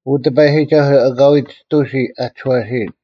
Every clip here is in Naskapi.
ᐅ ᑎᐸᔨᒋᒐᓱᐤ, ᐊᑲᐎᔾ ᒋᑐᓯ ᐊ ᒋᔄᓯᔨᓐ,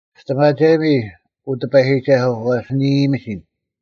ᒋᔅᑎᒪᒐᔨᒥ, ᐅ ᑎᐸᔨᒋᒐᓱᐤ, ᐛᔅ ᓂ ᐃᔨᔨᒥᓯᓐ: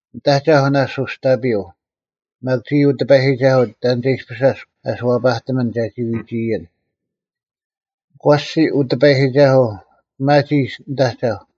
ᓂᑦ ᐊᒐᐧᒄ ᓇᔅᒡ ᐅᔅᑕᐱᔪᐤ: ᒪᒃ ᒋᔾ, ᐅ ᑎᐸᔨᒋᒐᓱᐤ, ᑕᓐ ᒐ ᐃᔅᐱᔅ ᐊᔅᒄ ᐊᓱᐛᐸᑎᒥᓐ ᒐᒋ ᐎᒋᔨᓐ? ᒂᔅᒋ, ᐅ ᑎᐸᔨᒋᒐᓱᐤ, ᐱᒪᒋ ᓂᑦ ᐊᒐᐧᒄ: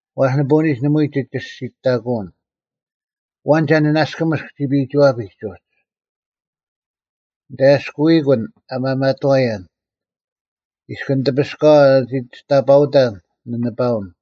ᐛᔅ ᓂᐳᐅᓂᒡ ᓇᒪᐎᔾ ᒋ ᒋᔅᒋᑕᑯᐅᓐ: ᐊᐛᓐ ᒐ ᓂᓇᔅᑯᒥᔅᒃ ᒋᐱᐃᒋᐛᐱᒡ ᐅᒡ? ᓂᑦ ᐊᔭᔅᑯᐃᑯᓐ ᐊ ᒪᒪᑥᔭᓐ; ᐃᔅᑭᓂ ᑎᐱᔅᑲᐛ ᓂᒋ ᒋᔅᑕᐸᐅᑕᓐ ᓂᓂᐸᐅᓐ;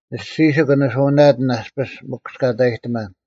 ᓂᔅᒋᓯᒄ ᓂᓱᐅᓇᑎᓐ ᐊᔅᐱᔅ ᒥᑯᔅᑲᑕᔨᑎᒪᓐ;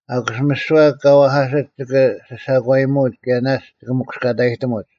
ᐊᑯᔅ ᒥᓯᐛ ᑲ ᐛᐧᑲᓯᒡ ᒋᑭ ᓯᓴᒂᔨᒧᐅᒡ ᑭᔭ ᓇᔅᒡ ᒋᑭ ᒥᑯᔅᑲᑕᔨᑎᒧᒡ;